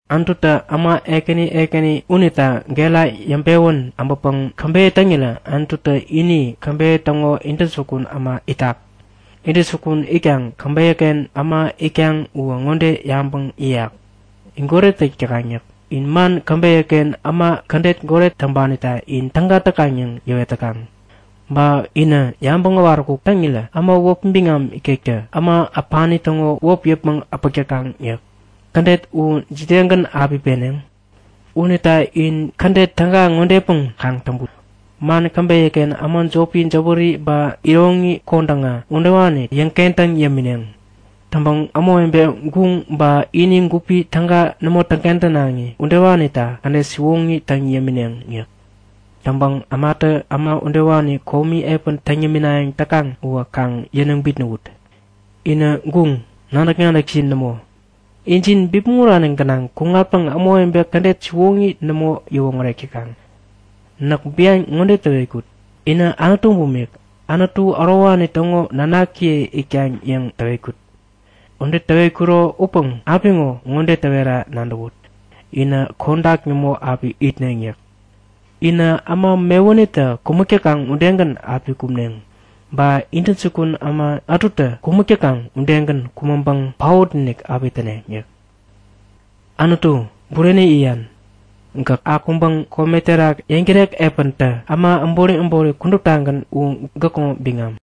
Anututä äma ekäni ekäni unita gera yäŋpewän äbäŋpäŋ käbeyä täŋirä Anututä ini käbeyä täŋo intäjukun äma itak. Intäjukun itkaŋ käbeyäken äma itkaŋ uwä ŋode yabäŋ yäyak; In goret täk täkaŋ yäk. In man käbeyäken äma kädet goret täŋpanita in täga täkaŋ yäŋ yäwet täkaŋ. Ba inä yabäŋ äwaräkuk täŋirä äma wäpi biŋam ikektä äma äpani täŋo wäpi yäpmäŋ äpäk täkaŋ yäk. Kädet u jidegän api peneŋ? Unita in kädet täga ŋodepäŋ kaŋ täŋput; Man käbeyäken äma jopi jäwäri ba iroŋi kodäŋa udewani yäŋkentäŋ yämineŋ. Täŋpäŋ ämawebe guŋ ba ini gupi täga nämo täŋkentänaŋi udewanita kädet siwoŋi täŋ yämineŋ yäk. Täŋpäŋ ämatä äma udewani komi epän täŋ yäminayäŋ täkaŋ uwä kaŋ yäniŋ bitnäwut. Inä guŋ, nadäk-nadäkjin nämo! Injin bipmäŋ urani gänaŋ kuŋatpäŋ ämawebe kädet siwoŋi nämo yäwoŋärek täkaŋ. Näk bian ŋode täwetkut; Inä anutu bumik, Anutu ärowani täŋo nanakiye itkaŋ yäŋ täwetkut. Ude täwetkuro upäŋ apiŋo ŋode täwera nadäwut! Inä kodak nämo api itneŋ yäk. In äma mewunitä kumäk täkaŋ udegän api kumneŋ! Ba intäjukun äma ätutä kumäk täkaŋ udegän kumäŋpäŋ paot-inik api täneŋ yäk. Anutu, bureni yäyan! Gäk akuŋpäŋ kome terak yäŋtärek epän tä! Äma äbori äbori kuduptagän u gäkŋo biŋam.